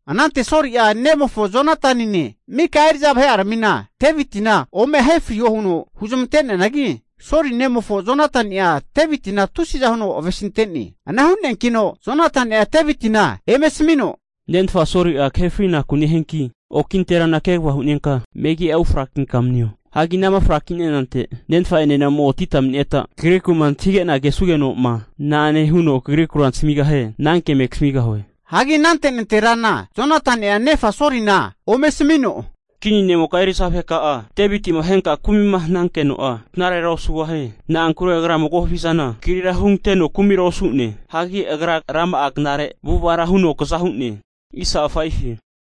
Anante Soli'a nemofo Jonatanine mika eri'za vahe'aramina Devitina ome ahe friho huno huzmante'neanagi, Soli nemofo Jonatani'a Devitina tusiza huno avesinte'ne. Ana hu'neankino Jonatani'a Devitina eme asamino, Nenfa Soli'a kahe fri'naku nehianki, oki nanterana kegava hu'nenka megi'a ufrakinka manio. Hagi anama fraki'nenante nenfa'enena ome otita mani'neta kagriku'ma antahige'na kesugenoma, na'ane huno kagrikura nasamigahie ananke eme kasamigahue. Hagi anante nanterana Jonatani'a nefa Solina ome asamino, kinimoka eri'za vaheka'a Devitima ahenka kumima hanankeno'a knarera osugahie. Na'ankure agra mago havizana kagrira huoganteno kumira osu'ne. Hagi agra rama'a knare avu'avara huno kaza hu'ne.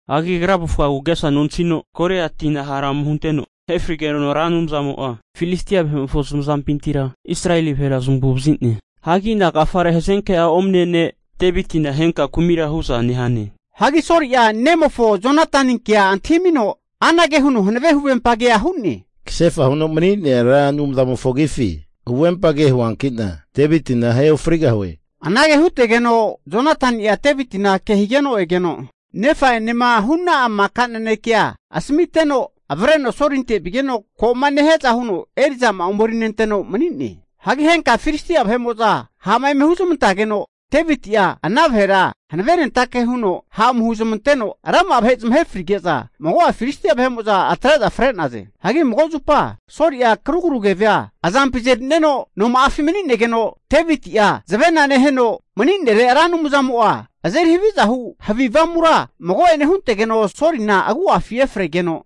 Hagi agra'a avufgagu agesa nontahino Goliatina hara ome hunteno ahe frigeno Ra Anumzamo'a Filistia vahe'mofo zamazampintira Israeli vahera zamagu'vazine. Hagi nagafare hazenke'a omane ne' Devitina ahenka kumira hu'za nehane? Hagi Soli'a nemofo Jonataninkea antahimino anage huno hanave huvempagea hu'ne, Kasefa huno mani'nea Ra Anumzamofo agifi huvempage huoanki'na, Devitina ahe ofrigahue. Anage hutegeno Jonatani'a Devitina ke higeno egeno, nefa'enema hu'na'a maka nanekea asamiteno, avreno Solinte vigeno ko'ma nehiaza huno eri'zama'a omerinenteno mani'ne. Hagi henka Filistia vahe'mo'za ha' eme huzmantageno, Deviti'a ana vahera hanavenentake huno ha' ome huzmanteno rama'a vahe zamahe frige'za, mago'a Filistia vahe'mo'za atre'za fre'naze. Hagi mago zupa Soli'a karugru keve'a azampi azerineno noma'afi mani'negeno, Devitia zavena neheno mani'nere Ra Anumzamo'a azeri haviza hu havi avamura mago'ene huntegeno Solina agu'afi efregeno,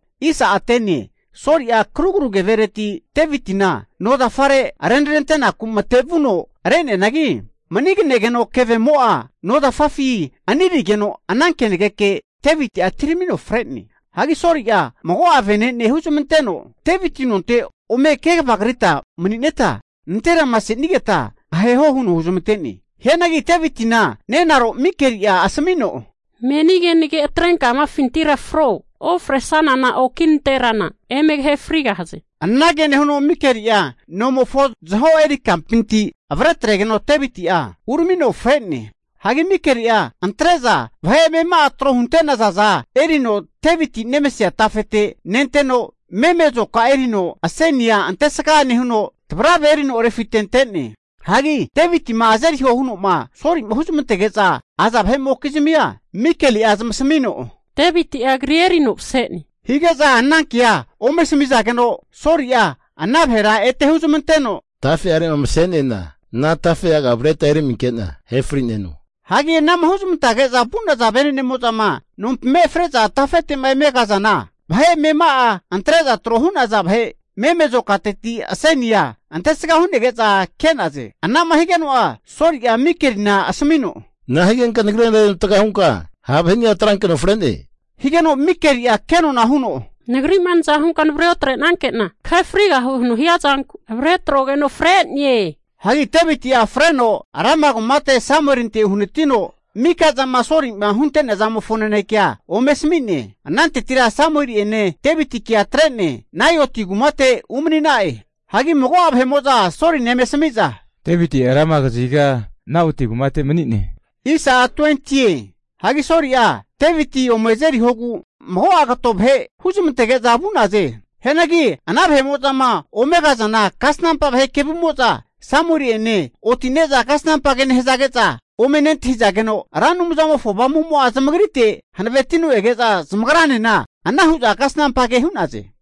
Soli'a karugru kevereti Devitina no zafare renarentenaku matevuno re'neanagi, mani'ganegeno kevemo'a nozafafi anirigeno, ana kenageke Deviti'a atiramino fre'ne. Hagi Soli'a mago'a vene'ne huzamanteno, Deviti nonte ome kvagrita mani'neta nanterama senigeta aheho huno huzamante'ne. Hianagi Devitina nenaro Mikeli'a asamino, Meni kenage atrenka amafintira fro, ofresanana oki nanterana eme kahefrigahaze. Anage nehuno Mikeli'a nomofo zaho eri kampinti avretregeno Deviti'a uramino fre'ne. Hagi Mikeli'a antre'za vahe amema'a tro hunte'nazaza erino Deviti'ma nemasea tafete nenteno meme azoka erino asenia antegsa nehuno, tavrave erino refitente'ne. Hagi Devitima azeriho huno'ma Solima huzamantege'za aza vahe'mokizmia Mikeli'a zamasamino, Deviti'a kri erino mase'ne. Hige'za ana kea ome asamizageno, Soli'a ana vahera ete huzmanteno, Tafe'arema mase'nena ana tafe'aga avreta emarerinke'na ahe fri'neno. Hagi anama huzmantage'za vu'naza vene'nemo'zama nompima efre'za tafete'ma eme kazana, vahe amema'a antre'za tro hu'naza vahe meme azokateti asenia antesga hu'nege'za ke'naze. Anama higeno'a Soli'a Mikelina asamino, nahigenka nagrira renavatga hunka ha' vahe'ni'a avretrankeno fre'ne? Higeno Mikeli'a kenona huno, nagri'ma naza hunka navre otre'nanke'na kahe frigahue huno hia zanku avre atrogeno fre'ne. Hagi Deviti'a freno Rama kumate Samuelinte uhanatino, maka zama Soli'ma hunteazamofo nanekea ome asami'ne. Anantetira Samueli'ene Devitikea atre'ne Naioti kumate umani'na'e. Hagi mago'a vahe'mo'za Solina eme asami'za, Deviti'a Rama kaziga Naoti kumate mani'ne. Hagi Soli'a Deviti ome azerihogu mago'a kato vahe huzmantege'za vu'naze. Hianagi ana vahe'mo'zama ome kazana kasnampa vahe kevumo'za Samueli'ene oti'ne'za kasnampa ke nehazage'za ome nentahizageno, Ra Anumzamofo Avamumo'a zamagritera hanavetino ege'za zamagranena ana hu'za kasnampa ke hu'naze.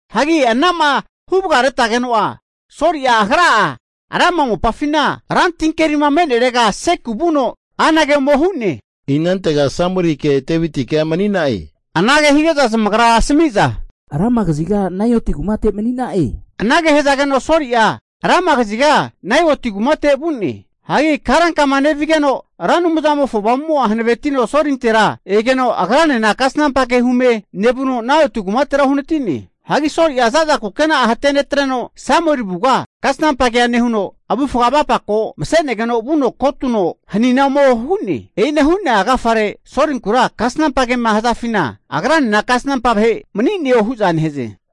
Hagi anama huvagareteno'a Soli'a agra'a Rama mopafima rantinkerima me'nerega Seku vuno anage ome hu'ne, inantega Samuelike Devitikea mani'na'e? Anage hige'za zamagra asamiza, Rama kaziga Naioti kumate mani'na'e hu'za asami'naze. Anage hazageno Soli'a Rama kaziga Naioti kumate vu'ne. Hagi karankama nevigeno Ra Anumzamofo Avamumo'a hanavetino Solintera egeno, agranena kasnampa ke hume nevuno Naioti kumatera uhanati'ne. Hagi Soli'a za'za kukena'a hatenetreno Samueli avuga kasnampa kea nehuno, avufga avapako mase'negeno vuno kotuno hanina ome hu'ne. E'ina hu'nea agafare Solinkura kasnampa kema hazafina, agranena kasnampa vahe mani'neo hu'za nehaze.